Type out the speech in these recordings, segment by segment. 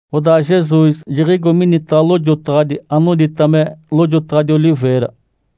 Odaa Jesus jiɡ̶igo minitaɡ̶a lojotaɡ̶adi anodita me “Lojotaɡ̶adi Oliveira”.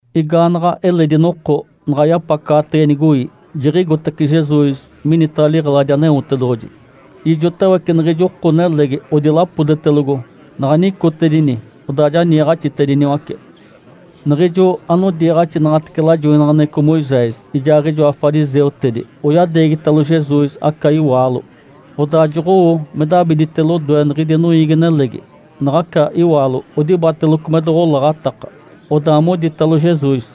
Igaanaɡ̶a eledi noko, naɡ̶a yapacaɡ̶atege nigoi, jiɡ̶igotace Jesus minitaɡ̶a liɡ̶eladi Aneotedoɡ̶oji. Ijotawece niɡ̶ijo oko-nelegi odilapodetelogo. Naɡ̶a nicotedini, odaa ja niiɡ̶axitediniwace. Niɡ̶ijo anodiiɡ̶axinaɡ̶atece lajoinaɡ̶aneɡ̶eco Moisés ijaaɡ̶ijoa fariseutedi oyadeegitalo Jesus aca iwaalo, odaa joɡ̶owo me dabidite lodoe niɡ̶idi noiigi-nelegi. Naɡ̶aca iwaalo odibateloco me doɡ̶olaɡ̶ataka. Odaa moditalo Jesus,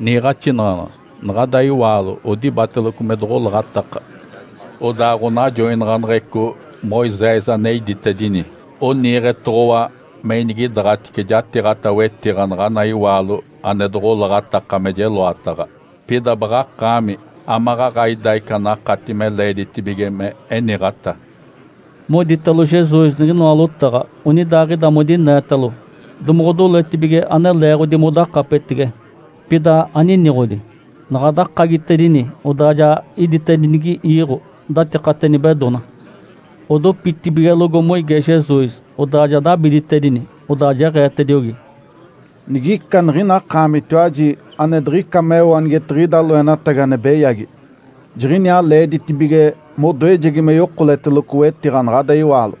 “Niiɡ̶axinaɡ̶anaɡ̶a. Naɡ̶ada iwaalo odibateloco me doɡ̶olaɡ̶ataka. Odaa ɡ̶onajoinaɡ̶aneɡ̶eco, Moisés ane iditedini, oniiɡ̶etoɡ̶owa me inigidaaɡ̶atice jatiiɡ̶ata wetiɡ̶a naɡ̶ana iwaalo ane doɡ̶olaɡ̶ataka me jeloataɡ̶a. Pida baɡ̶akaami, amaɡ̶aɡ̶a ida ica anakati me leeditibige me eniɡ̶ata?” Moditalo Jesus niɡ̶inoa lotaɡ̶a onidaaɡ̶ida modineetalo, domoɡ̶odoletibige ane leeɡ̶odi modakapetege. Pida aniniɡ̶odi. Naɡ̶a dakagitedini, odaa ja iditedinigi iiɡ̶o datikate nibedona. Odopitibigelogo moige Jesus. Odaa ja dabiditedini, odaa jeɡ̶eetediogi, “Nigica niɡ̶ina akaamitiwaji ane diɡ̶ica meo anigetiɡ̶ida loenatagi ane beyagi, jiɡ̶iniaa leeditibige modoejegi me yokoleteloco wetiɡ̶a naɡ̶ada iwaalo”.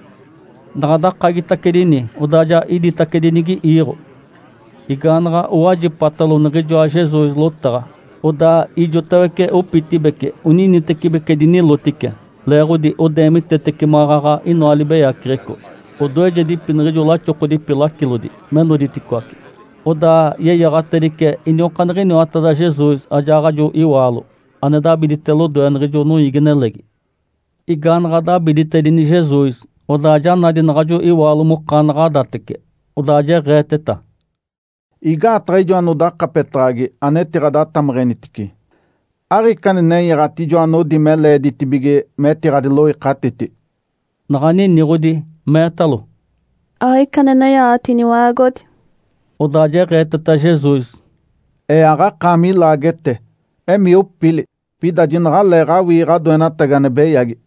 Naɡ̶a dakagitacedini, odaa ja iditacedinigi iiɡ̶o. Igaanaɡ̶a owajipatalo niɡ̶ijoa Jesus lotaɡ̶a, odaa ijotawece opitibeci oninitecibeci dinilotice, leeɡ̶odi odeemitetece maɡ̶aɡ̶a inoa libeyaceɡ̶eco. Odoejedipi niɡ̶ijo laxokodipi lacilodi me noditicoaci. Odaa yeyaɡ̶atedice iniokaaniɡ̶iniwateda Jesus ajaaɡ̶ajo iwaalo ane dabidite lodoe niɡ̶ijo noiigi-nelegi. Igaanaɡ̶a dabiditedini Jesus, odaa ja nadi naɡ̶ajo iwaalo mokanaɡ̶adatece. Odaa jeɡ̶eeteta, “Igaataɡ̶a ijo anodakapetaɡ̶agi, anetiɡ̶adatameɡ̶enitice? Aɡ̶ica ane nenyaɡ̶ati ijoa anodi me leeditibige metiɡ̶adiloikatiti?” Naɡ̶a niniɡ̶odi meetalo, “Aɡ̶ica ane nenyaɡ̶ati, Iniwa-aagodi”. Odaa jeɡ̶eeteta Jesus, “Ee aɡ̶akaami ilaagete. Emii opili, pida jinaɡ̶aleeɡ̶awii ɡ̶adoenatagi ane beyagi”.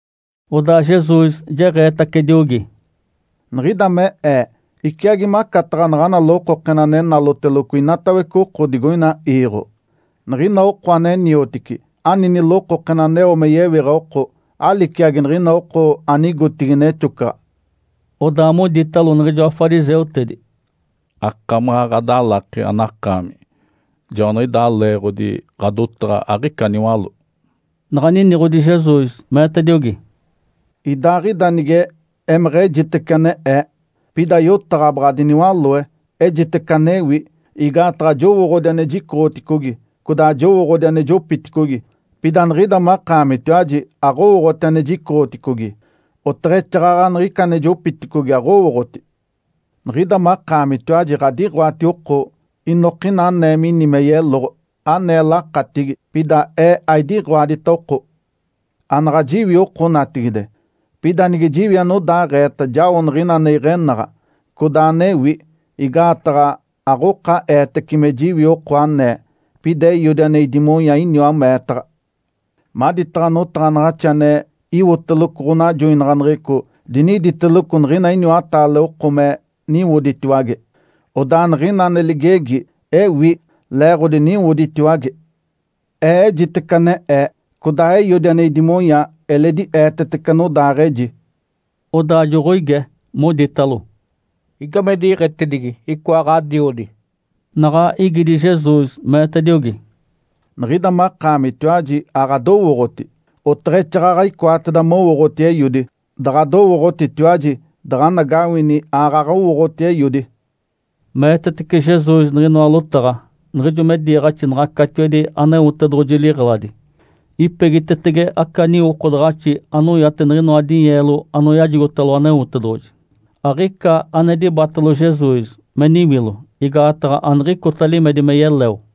Odaa Jesus jeɡ̶eetacediogi, “Niɡ̶ida mee Ee iciagi macataɡ̶a naɡ̶ana lokokena ane naloteloco inatawece oko digoina iiɡ̶o. Niɡ̶ina oko ane niotici ani nilokokena aneo me yewiɡ̶a oko, aliciagi niɡ̶ina oko anigotigi nexocaɡ̶a”. Odaa moditalo niɡ̶ijoa fariseutedi, “Akamaɡ̶a ɡ̶adalaki anakaami. Joaniɡ̶idaa leeɡ̶odi ɡ̶adotaɡ̶a aɡ̶ica niwaló.” Naɡ̶a niniɡ̶odi Jesus, meetediogi, “Idaaɡ̶ida nige emeɡ̶ejitece ane Ee, pida yotaɡ̶a baɡ̶a diniwaloe, ejitece anewi. Igaataɡ̶a jowooɡ̶odi ane jicoɡ̶oticogi codaa jowooɡ̶odi ane jopiticogi. Pida niɡ̶ida makaamitiwaji aɡ̶owooɡ̶oti ane jicoɡ̶oticogi, oteɡ̶exaaɡ̶aɡ̶a niɡ̶ica ane jopiticogi aɡ̶owooɡ̶oti. Niɡ̶ida makaamitiwaji ɡ̶adiɡ̶oati oko inokina anee mini me yeloɡ̶o, ane lakatigi, pida Ee aidiɡ̶oadita oko. Anaɡ̶a jiwi oko natigide, pida nige jiwi anodaaɡ̶eeta jao niɡ̶ina ane iɡ̶enaɡ̶a, codaa anewi. Igaataɡ̶a aɡ̶oka eetece me jiwi oko anee. Pida Eiodi ane idimonya iniwa meetaɡ̶a. Maditaɡ̶a notaɡ̶anaɡ̶axi ane iwotelogo ɡ̶onajoinaɡ̶aneɡ̶eco diniditeloco niɡ̶ina iniwataale oko me niwoditiwage, odaa niɡ̶ina ane ligegi ewi, leeɡ̶odi niwoditiwage. Ee ejitece ane Ee, codaa Eiodi ane idimonya eledi eetetece anodaaɡ̶eji”. Odaa joɡ̶oige, moditalo, “Igame diɡ̶etedigi icoa ɡ̶adiodi?” Naɡ̶a igidi Jesus, meetediogi, “Niɡ̶ida makaamitiwaji aɡ̶adowooɡ̶oti, oteɡ̶exaaɡ̶aɡ̶a icoateda mowooɡ̶oti Eiodi. Daɡ̶adowooɡ̶otitiwaji, daɡ̶anagawini aaɡ̶aɡ̶a owooɡ̶oti Eiodi”. Meetetece Jesus niɡ̶inoa lotaɡ̶a niɡ̶ijo me diiɡ̶axinaɡ̶a catiwedi Aneotedoɡ̶oji liɡ̶eladi, ipegitetege aca niwokodaɡ̶axi anoyate niɡ̶inoa dinyeelo anoyajigotalo Aneotedoɡ̶oji. Aɡ̶ica ane dibatalo Jesus me niwilo, igaataɡ̶a aniɡ̶icota limedi me yeleo.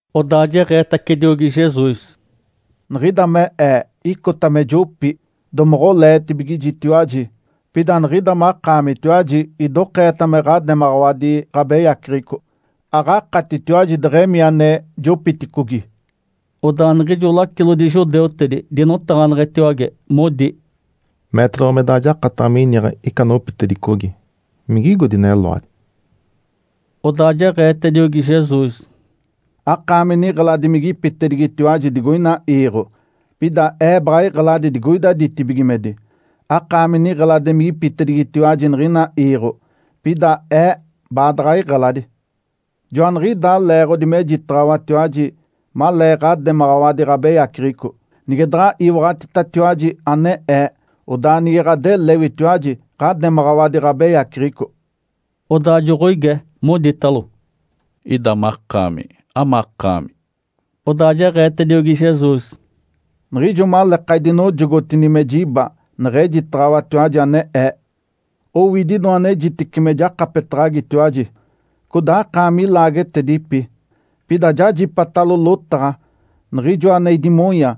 Odaa jeɡ̶eetacediogi Jesus, “Niɡ̶ida me Ee icota me jopi. Domoɡ̶oleetibigijitiwaji. Pida niɡ̶ida makaamitiwaji idokeeta me ɡ̶ademaɡ̶awadi ɡ̶abeyaceɡ̶eco. Aɡ̶akatitiwaji deɡ̶emii ane jopiticogi”. Odaa niɡ̶ijo lacilodi judeutedi dinotaɡ̶aneɡ̶etiwage, modi, “Meetedoɡ̶owa me daɡ̶a jakataɡ̶a miniɡ̶a ica anopitedicogi. Migigo dineloadi?” Odaa jeɡ̶eetediogi Jesus, “Akaami niɡ̶eladimigipitedigitiwaji digoina iiɡ̶o. Pida Ee baɡ̶a iɡ̶eladi digoida ditibigimedi. Akaami niɡ̶eladimigipitedigitiwaji niɡ̶ina iiɡ̶o, pida Ee baadaɡ̶a iɡ̶eladi. Joaniɡ̶idaa leeɡ̶odi mejitaɡ̶awatiwaji malee ɡ̶ademaɡ̶awadi ɡ̶abeyaceɡ̶eco. Nige daɡ̶a iwaɡ̶atitatiwaji ane Ee, odaa nige ɡ̶adelewitiwaji ɡ̶ademaɡ̶awadi ɡ̶abeyaceɡ̶eco”. Odaa joɡ̶oige, moditalo, “Ida makaami amakaami?” Odaa jeɡ̶eetediogi Jesus, “Niɡ̶ijo maleeka idinojogotini me jiba neɡ̶ejitaɡ̶awatiwaji ane Ee. Owidi inoa anejitece me jakapetaɡ̶agitiwaji, codaa akaami ilaagetedipi. Pida jajipatalo lotaɡ̶a Niɡ̶ijoa ane idimonya,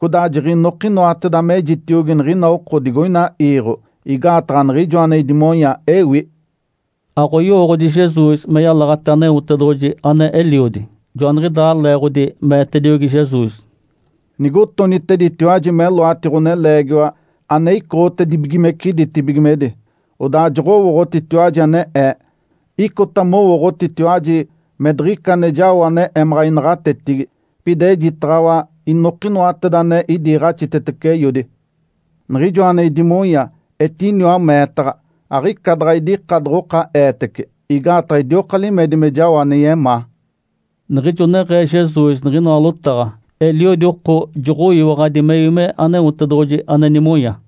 codaa jiɡ̶inokinoateda mejitiogi niɡ̶ina oko digoina iiɡ̶o. Igaataɡ̶a Niɡ̶ijoa ane idimonya, ewi”. Aɡ̶oyowooɡ̶odi Jesus me yalaɡ̶ate Aneotedoɡ̶oji, ane Eliodi. Joaniɡ̶idaa leeɡ̶odi meetediogi Jesus, “Nigotoniteditiwaji meloati Ǥoneleegiwa ane icoɡ̶otibigimece ditibigimedi, odaa joɡ̶owooɡ̶otitiwaji ane Ee. Icota mowooɡ̶otitiwaji me diɡ̶ica ane jao ane emaɡ̶a inaɡ̶atetigi. Pida ejitaɡ̶awa inokinoateda ane idiiɡ̶axitetece Eiodi. Niɡ̶ijoa ane idimonya etiniwa meetaɡ̶a. Aɡ̶ica daɡ̶a idika doɡ̶oka eetece, igaataɡ̶a idioka limedi me jao ane yemaa”. Niɡ̶ijo neɡ̶ee Jesus niɡ̶inoa lotaɡ̶a, eliodi oko joɡ̶oyiwaɡ̶adi mewi me Aneotedoɡ̶oji ane nimonya.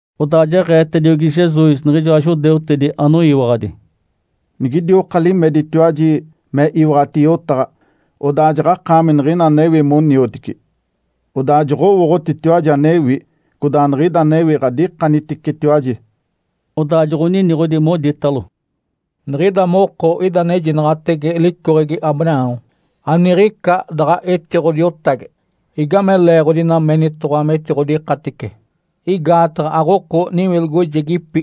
Odaa jeɡ̶eetediogi Jesus niɡ̶ijoa judeutedi anoyiwaɡ̶adi, “Nigidioka limeditatiwaji me iwaɡ̶ati yotaɡ̶a, odaa jaɡ̶akaami niɡ̶ina anewi moniotici. Odaa joɡ̶owooɡ̶otitiwaji anewi, codaa niɡ̶ida anewi ɡ̶adikaniticetiwaji”. Odaa joɡ̶oniniɡ̶odi, moditalo, “Niɡ̶ida moko ida anejinaɡ̶atege licoɡ̶egi Abraão. Aniɡ̶ica daɡ̶a etiɡ̶odiotage. Igame leeɡ̶odi ina menitoɡ̶owa metiɡ̶odikatice? Igaataɡ̶a aɡ̶oko niwilogojegipi.”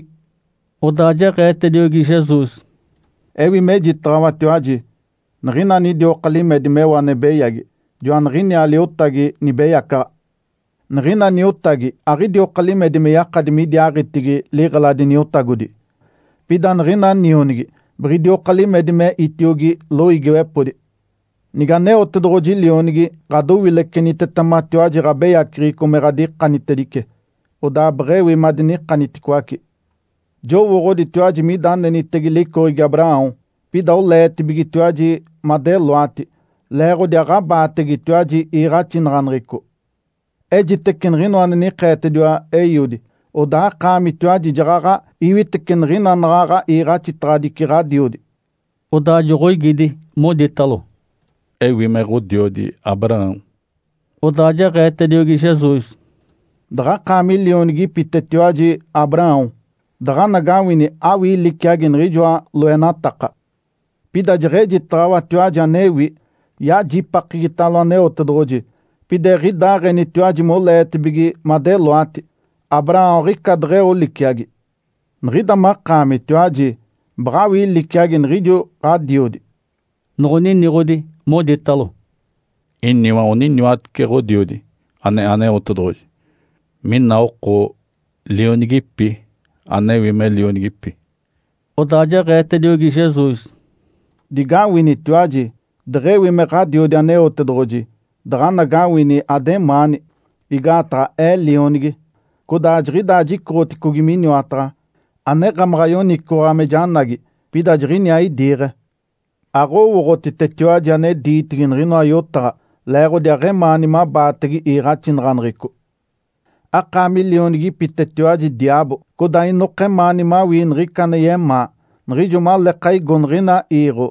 Odaa jeɡ̶eetediogi Jesus, “Ewi mejitaɡ̶awatiwaji, niɡ̶ina anidioka limedi meo ane beyagi, joaniɡ̶iniaa liotagi nibeyacaɡ̶a. Niɡ̶ina niotagi aɡ̶idioka limedi me yakadi midiaaɡ̶itigi liɡ̶eladi niotagodi. Pida niɡ̶ina nionigi biɡ̶idioka limedi me itiogi loiigiwepodi. Nige Aneotedoɡ̶oji Lionigi ɡ̶adowilecenitetematiwaji ɡ̶abeyaceɡ̶eco me ɡ̶adikanitedice, odaa beɡ̶ewi madinikaniticoace. Jowooɡ̶oditiwaji mida anenitege licoɡ̶egi Abraão, pida oleetibigetiwaji madeloati, leeɡ̶odi aɡ̶abaategetiwaji iiɡ̶axinaɡ̶aneɡ̶eco. Ejitece niɡ̶inoa ane nikeetediwa Eiodi. Odaa akaamitiwaji jaɡ̶aɡ̶a iwitece niɡ̶ina anaɡ̶aɡ̶a iiɡ̶axitaɡ̶adici ɡ̶adiodi”. Odaa joɡ̶oigidi, moditalo, “Ewi me ɡ̶odiodi Abraão”. Odaa jeɡ̶eetediogi Jesus, “Daɡ̶akaami lionigipitetiwaji Abraão, daɡ̶anagawini awii liciagi niɡ̶ijoa loenataka. Pida jeɡ̶ejitaɡ̶awatiwaji anewi, yajipakegitalo Aneotedoɡ̶oji. Pida eɡ̶idaaɡ̶enitiwaji moleetibige madeloati. Abraão aɡ̶ica deɡ̶eo liciagi. Niɡ̶ida makaamitiwaji baɡ̶awii liciagi niɡ̶ijo ɡ̶adiodi”. Noɡ̶oniniɡ̶odi, moditalo, “Iniwa oniniwatece Ǥodiodi, ane Aneotedoɡ̶oji. Mina oko lionigipi, anewi me lionigipi.” Odaa jeɡ̶eetediogi Jesus, “Digawinitiwaji, deɡ̶ewi me Ǥadiodi Aneotedoɡ̶oji, daɡ̶anagawini ademaani, igaataɡ̶a Ee Lionigi, codaa jiɡ̶idaa jicoɡ̶oticogi miniwataɡ̶a. Aneɡ̶emaɡ̶a yoniciwaɡ̶a me janagi, pida jiɡ̶iniaa idiiɡ̶e. Aɡ̶owooɡ̶otitetiwaji ane diitigi niɡ̶inoa yotaɡ̶a, leeɡ̶odi aɡ̶emaani mabaatege iiɡ̶axinaɡ̶aneɡ̶eco. Akaami lionigipitetiwaji diaabo, codaa inoka emaani mawii niɡ̶ica ane yemaa. Niɡ̶ijo maleeka igo niɡ̶ina iiɡ̶o,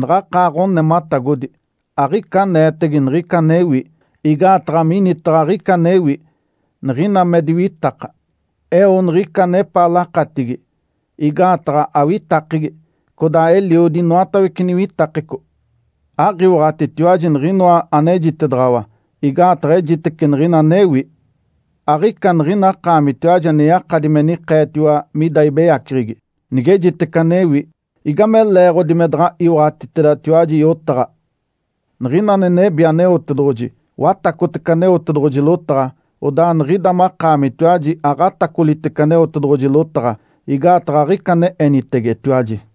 naɡ̶akaa ɡ̶onematagodi. Aɡ̶ica aneetege niɡ̶ica anewi, igaataɡ̶a minitaɡ̶a aɡ̶ica anewi. Niɡ̶ina me diwitaka, eo niɡ̶ica anepaa lakatigi, igaataɡ̶a awitakegi. Codaa eliodi inoatawece niwitakeco. Aɡ̶iwaɡ̶atitiwaji niɡ̶inoa anejitedaɡ̶awa, igaataɡ̶a ejitece niɡ̶ina anewi. Aɡ̶ica niɡ̶ina akaamitiwaji ane yakadi me nikeetiwa mida ibeyaceɡ̶egi. Nigejitece anewi, igame leeɡ̶odi me daɡ̶a iwaɡ̶atitedatiwaji yotaɡ̶a? Niɡ̶ina ane nebi Aneotedoɡ̶oji, watacotece Aneotedoɡ̶oji lotaɡ̶a. Odaa niɡ̶ida makaamitiwaji aɡ̶atacolitece Aneotedoɡ̶oji lotaɡ̶a, igaataɡ̶a aɡ̶ica ane enitegetetiwaji”.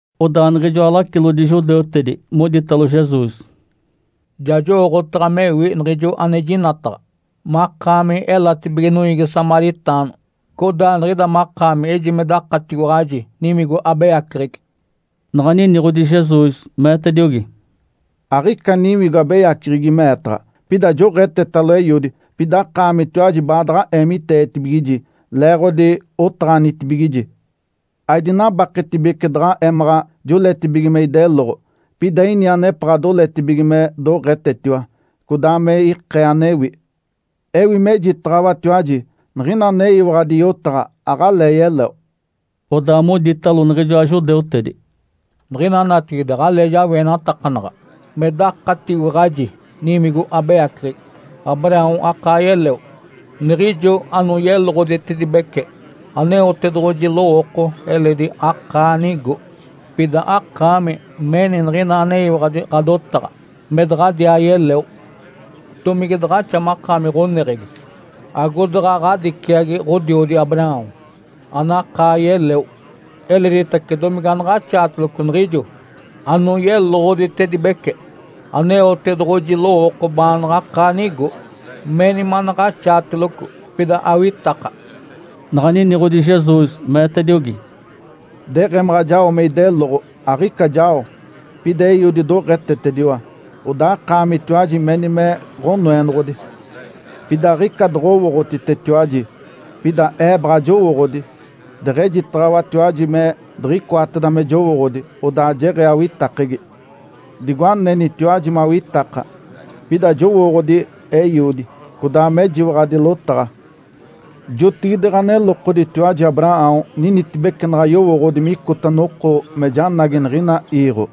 Odaa niɡ̶ijoa lacilodi judeutedi moditalo Jesus, “Ja jowooɡ̶otaɡ̶a mewi niɡ̶ijo anejinaɡ̶ata, makaami elatibige noiigi samaritaano, codaa niɡ̶ida makaami ejime dakatiwaɡ̶aji niwigo abeyaceɡ̶egi”. Naɡ̶a niniɡ̶odi Jesus, meetediogi, “Aɡ̶ica niwigo abeyaceɡ̶egi meetaɡ̶a. Pida joɡ̶etetalo Eiodi, pida akaamitiwaji baadaɡ̶a eemiteetibigiji, leeɡ̶odi otaɡ̶anitibigiji. Aidinabaketibece daɡ̶a emaɡ̶a joletibige me ideloɡ̶o. Pida ini anepaɡ̶a doletibige me doɡ̶etetiwa, codaa me ikee anewi. Ewi mejitaɡ̶awatiwaji, niɡ̶ina aneyiwaɡ̶adi yotaɡ̶a, aɡ̶alee yeleo”. Odaa moditalo niɡ̶ijoa judeutedi, “Niɡ̶ina natigide aɡ̶alee jawienatakanaɡ̶a me dakatiwaɡ̶aji niwigo abeyaceɡ̶egi. Abraão akaa yeleo, niɡ̶ijo anoyeloɡ̶oditedibece Aneotedoɡ̶oji lowooko eledi akaa nigo. Pida akaami meni niɡ̶ina aneyiwaɡ̶adi ɡ̶adotaɡ̶a me daɡ̶adiaa yeleo. Domige daɡ̶axa makaami ɡ̶oneɡ̶egi, agodaɡ̶a ɡ̶adiciagi ɡ̶odiodi Abraão anakaa yeleo? Eleditace domige anaɡ̶axaateloco niɡ̶ijo anoyeloɡ̶oditedibece Aneotedoɡ̶oji lowooko baanaɡ̶a akaa nigo? Meni manaɡ̶axaateloco, pida awitaka!” Naɡ̶a niniɡ̶odi Jesus, meetediogi, “Deɡ̶emaɡ̶a jao me ideloɡ̶o, aɡ̶ica jao. Pida Eiodi doɡ̶etetediwa. Odaa akaamitiwaji meni me Ǥanoenoɡ̶odi. Pida aɡ̶ica doɡ̶owooɡ̶otitetiwaji. Pida Ee baɡ̶a jowooɡ̶odi. Deɡ̶ejitaɡ̶awatiwaji me diɡ̶icoateda me jowooɡ̶odi, odaa jeɡ̶ee awitakegi, digo anenitiwaji mawitaka. Pida jowooɡ̶odi Eiodi, codaa mejiwaɡ̶adi lotaɡ̶a. Jotigide ɡ̶anelokoditiwaji Abraão ninitibece naɡ̶a yowooɡ̶odi micota noko me janagi niɡ̶ina iiɡ̶o.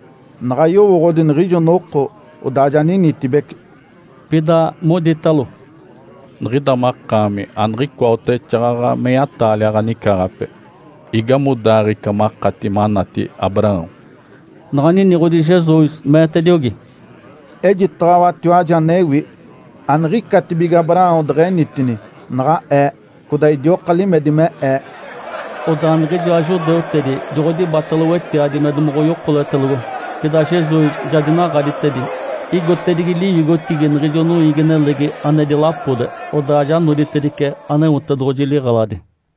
Naɡ̶a yowooɡ̶odi niɡ̶ijo noko, odaa ja ninitibece”. Pida moditalo, “Niɡ̶ida makaami aniɡ̶icoa oteɡ̶exaaɡ̶aɡ̶a meya-taalia ɡ̶anicaaɡ̶ape. Igamodaaɡ̶ee ica makati manati Abraão?” Naɡ̶a niniɡ̶odi Jesus, meetediogi, “Ejitaɡ̶awatiwaji anewi. Aniɡ̶icatibige Abraão deɡ̶enitini, naɡ̶a Ee, codaa idioka limedi me Ee”. Odaa niɡ̶ijoa judeutedi joɡ̶odibatalo wetiadi me domaɡ̶a oyokoletelogo, pida Jesus ja dinaɡ̶aditedi. Igotedigi liwigotigi niɡ̶ijo noiigi-nelegi ane dilapode, odaa ja noditedice Aneotedoɡ̶oji liɡ̶eladi.